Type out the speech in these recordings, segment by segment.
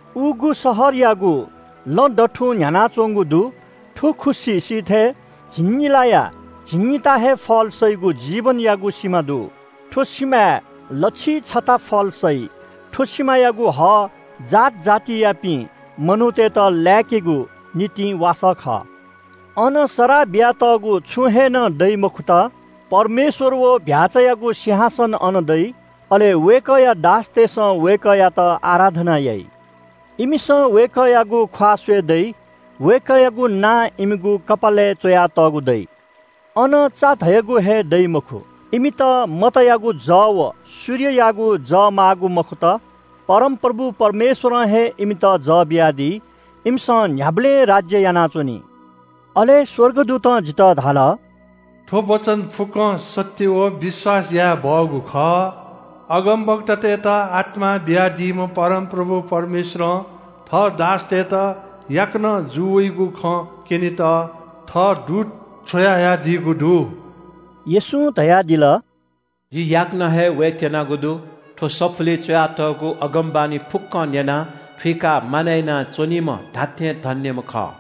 उगु शहरयागु लँ दथुं न्‍ह्यानाच्‍वंगु दु। थ्‍व खुसि सिथय् झिंनिलाया झिंनिता हे फल सइगु जीवनयागु सिमा दु। थ्‍व सिमाय् लच्‍छिइ छता फल सइ। थ्‍व सिमायागु हः जात जातियापिं मनूतय्‌त लाय्‌केगु निंतिं वासः खः। अन सराः बियातःगु छुं हे नं दइ मखुत। परमेश्‍वर व चीधिकःम्‍ह भ्‍याःचायागु सिंहासन अन दइ। अले वय्‌कःया दासतय्‌सं वय्‌कःयात आराधना याइ। इमिसं वय्‌कःयागु ख्‍वाः स्‍वये दइ। वय्‌कःयागु नां इमिगु कपालय् च्‍वयातःगु दइ। अन चा धयागु हे दइ मखु। इमित मतयागु जः व सूर्ययागु जः माःगु मखुत। परमप्रभु परमेश्‍वरं हे इमित जः बियादी। इमिसं न्‍ह्याबलें राज्‍य यानाच्‍वनी। अले स्‍वर्गदूतं जितः धाल – “थ्‍व वचन फुक्‍कं सत्‍य व विश्‍वास याये बहःगु खः। अगमवक्तातय्‌त आत्‍मा बियादीम्‍ह परमप्रभु परमेश्‍वरं थः दासतय्‌त याकनं जू वइगु खँ क्‍यनेत थः दूत छ्वयाहयादीगु दु।” येशूं धयादिल – “जि याकनं हे वयेत्‍यनागु दु। थ्‍व सफुलिइ च्‍वयातःगु अगमवाणी फुक्‍कं न्‍यनाः थुइकाः मानय् यानाच्‍वनीम्‍ह धात्‍थें धन्‍यम्‍ह खः।”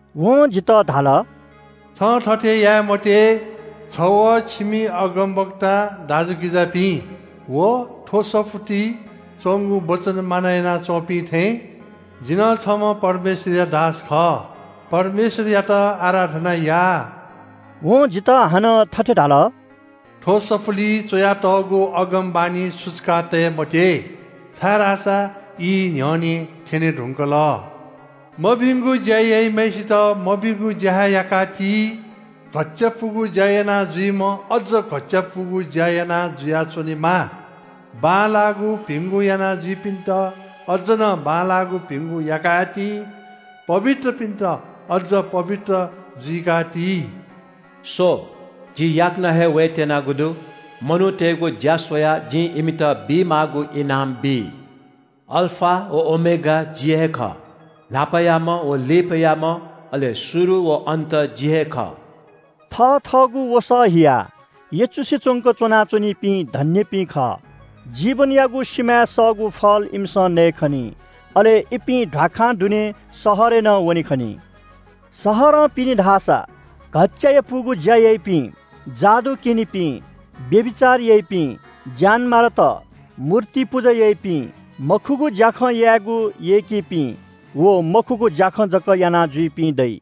वं जितः धाल – “छं थथे याये मते। छ व छिमि अगमवक्ता दाजुकिजापिं व थ्‍व सफुलिइ च्‍वंगु वचन मानय् यानाच्‍वंपिं थें जि नं छम्‍ह परमेश्‍वरया दास खः। परमेश्‍वरयात आराधना या।” वं जितः हानं थथे धाल – “थ्‍व सफुलिइ च्‍वयातःगु अगमवाणी सुचुकातये मते, छाय्‌धाःसा ई न्‍ह्यःने थ्‍यने धुंकल। मभिंगु ज्‍या याइम्‍हय्‌सित मभिंगु ज्‍या हे याका ति। घच्‍चायापुगु ज्‍या यानाजुइम्‍ह अझ घच्‍चायापुगु ज्‍या याना जुयाच्‍वनेमा। बांलाःगु भिंगु यानाजुइपिन्‍त अझ नं बांलाःगु भिंगु याका हे ति। पवित्रपिन्‍त अझ पवित्र जुइका ति।” “स्‍व, जि याकनं हे वयेत्‍यनागु दु। मनूतय्‌गु ज्‍या स्‍वयाः जिं इमित बीमाःगु इनाम बी। अल्‍फा व ओमेगा जि हे खः। न्‍हापायाम्‍ह व लिपायाम्‍ह, अले शुरु व अन्‍त जि हे खः।” थथःगु वसः हियाः यचुसे च्‍वंक च्‍वना च्‍वनीपिं धन्‍यपिं खः। जीवनयागु सिमाय् सःगु फल इमिसं नयेखनी, अले इपिं ध्‍वाखां दुने शहरय् नं वने खनी। शहरं पिने धाःसा घच्‍चायापुगु ज्‍या याइपिं, जादु क्‍यनिपिं, व्‍यभिचार याइपिं, ज्‍यानमारात, मूर्ति पुजा याइपिं, मखुगु ज्‍याखँ यायेगु यय्‌कीपिं व मखुगु ज्‍याखँ जक यानाजुइपिं दइ।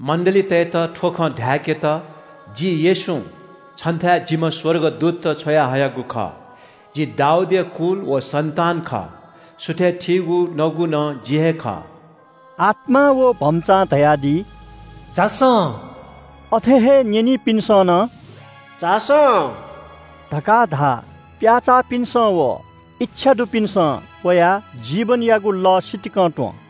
“मण्‍डलीतय्‌त थ्‍व खँ धाय्‌केत जि येशूं छन्‍थाय् जिम्‍ह स्‍वर्गदूत छ्वयाहयागु खः। जि दाऊदया कुल व सन्‍तान खः। सुथय् थीगु नगु नं जि हे खः।” आत्‍मा व भम्‍चां धयादी – “झासँ।” अथे हे न्‍यनीपिन्‍सं नं “झासँ” धकाः धा। प्‍याचाःपिन्‍सं व इच्‍छादुपिन्‍सं वयाः जीवनयागु लः सितिकं त्‍वँ।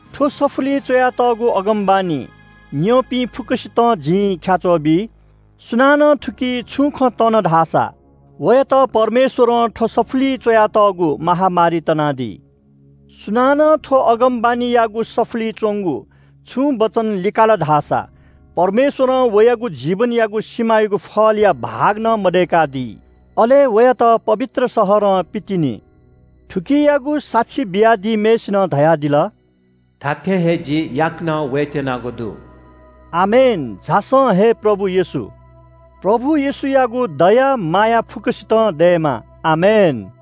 थ्‍व सफुलिइ च्‍वयातःगु अगमवाणी न्‍यंपिं फुक्‍कसितं जिं ख्‍याच्‍वः बी – सुनानं थुकी छुं खँ तन धाःसा वयात परमेश्‍वरं थ्‍व सफुलिइ च्‍वयातःगु महामारी तनादी। सुनानं थ्‍व अगमवाणीयागु सफुलिइ च्‍वंगु छुं वचन लिकाल धाःसा परमेश्‍वरं वयागु जीवनयागु सिमायागु फलया भाग नं मदय्‌कादी। अले वयात पवित्र शहरं पितिनी। थुकियागु साक्षी बियादीम्‍हय्‌सिनं धयादिल “धात्‍थें हे जि याकनं वयेत्‍यनागु दु।” आमेन, झासँ हे प्रभु येशू। प्रभु येशूयागु दया माया फुक्‍कसित दयेमा। आमेन।